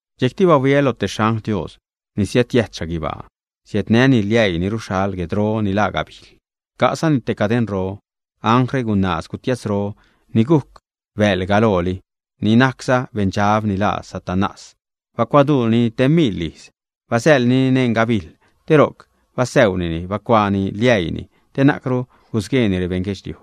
Dxejcti bahuiä loj te xangl Dios ni siädjiäjt xhaguibaa, siädnäni liäii ni ruxhal guedro ni laa gabijl. Ca'zani te cadeṉro. Anglre gunaaz gutiatzroga, ni gujc bäḻ galooli, ni najcza beṉdxab, ni laaza Satanás. Bacuaduunini te miḻ ijz. Basäḻnini neṉ gabijl, te ro'c basäunini, bacuaani liäii te na'cru gusgueeni rebeṉ guedxliuj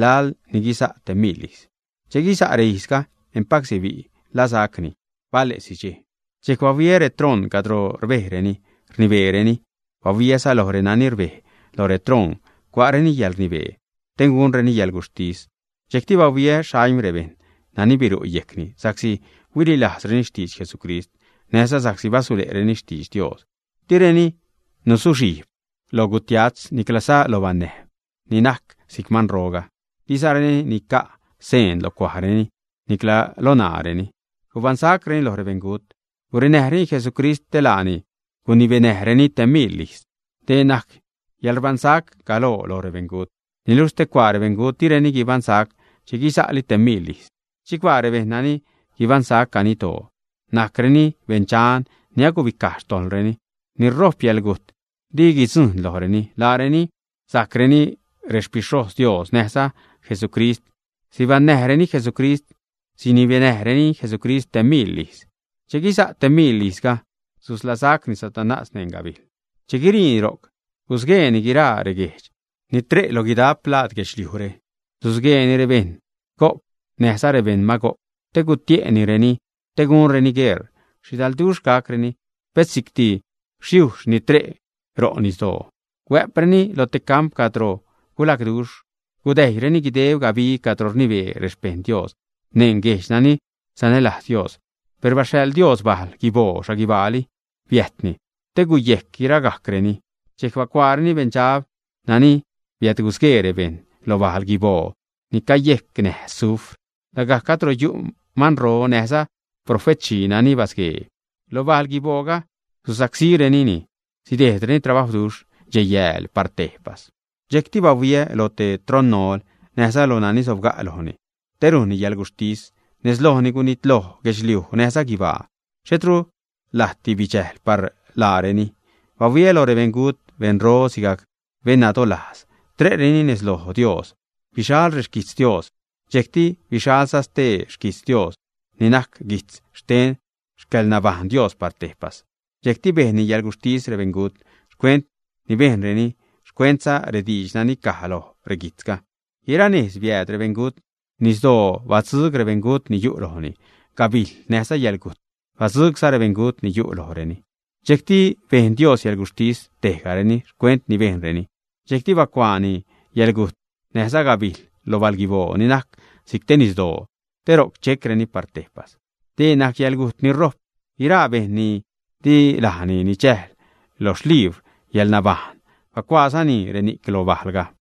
laḻ ni guiza' te miḻ ijz. Che guiza' reijzga, empac sibi' ḻasacni bale'si dxej. Dxejc bahuiä retroṉ cadro rbejreni rnibeereni, bahuiäza loj renani rbej lo retroṉ, cua'reni yäḻrnibee te gunreni yäḻguxhtis. Dxejcti bahuiä xaim rebejṉ nani biru' yejcni sa'csi huililajzreni xtidx Jesucrist näjza sa'csi basule'reni xtidx Dios. Direni nuzuxhijb loj gutiatz niclaza lo banäjb ni najc si'c manroga, dizareni nica' seen lo cuajreni nicla lo ṉaareni. Gubaṉsacreni loj rebeṉgut, gurenäjreni Jesucrist te laani gunibenäjreni te miḻ ijz. Dee najc yäḻrbaṉsac galoo lo rebeṉgut. Niluxh stecuaa rebeṉgut, direni guibaṉsac che guisa'li te miḻ ijz. Chicbaa rebejṉ nani guibaṉsac ganiddoo, najcreni beṉdxan ni agubicaj xtojḻreni. Ni rojp yäḻgujt di guidzujṉ lojreni. Laareni sajcreni xpixhojz Dios näjza Jesucrist, sibenäjreni Jesucrist, sinibenäjreni Jesucrist te miḻ ijz. Che guiza' te miḻ ijzga, susḻasacni Satanás neṉ gabijl. Che guiriini ro'c, gusgueeni guiraa reguejdx ni tre' lo guidap laad guedxliujre. Susgueeni rebeṉ Gog näjza rebeṉ Magog te gutie'nireni te gunreni gueṟ. Xhidalduxh gacreni, pet si'cti yujxh ni tre' ro' nisdoo. Huä'preni lo te camp cadro gulagduxh. Gudäjyreni guideb gabig cadro rnibee rexpejṉ Dios neṉ guejdx nani sanälajz Dios. Per baxhaḻ Dios bal guiboo xhaguibaali bitejbni, te guyejc guiragajcreni. Dxejc bacuaareni beṉdxab nani biädgusguee rebejṉ lo bal guiboo ni cayecnäj sufr, lagajc cadro yu' manro, näjza profetxhii nani basguee; lo bal guibooga susacsírenini sidejdreni trabawduxh dxej-yääl par tejpas. Dxejcti bahuiä lo te troṉronol näjza lo nani sobga' lojni te rujnni yäḻguxhtis. Nez lojni gunitlojli guedxliuj näjza guibaa, xhetru lajtdi bidxäjl par laareni. Bahuiä lo rebeṉgut, beṉro sigajc beṉnadolajz, tre'reni nez lo Dios. Bixal rexquijtz Dios, dxejcti bixalza stee xquijtz Dios ni najc guijtz xten xcäḻnabaṉnäj Dios par tejpas. Dxejcti bejnni yäḻgutxhtis rebeṉgut xcuent ni bejnreni, xcuentza rediidx nani caj loj reguijtzga. Guiranejz biääd rebeṉgut: nisdoo batzuug rebeṉgut ni yu' lojni, gabijl näjza yäḻgujt batzuugza rebeṉgut ni yu' lojreni. Dxejcti bejn Dios yäḻguxhtis tejgareni xcuent ni bejnreni. Dxejcti bacuaani yäḻgujt näjza gabijl lo bal guiboo ni najc si'c te nisdoo te ro'c checreni par tejpas. Dee najc yäḻgujt ni rojp. Guiraa bejṉ ni di lajni nidxäjl lo xlibr yäḻnabajṉ bacuaazani reni'c lo bajlga.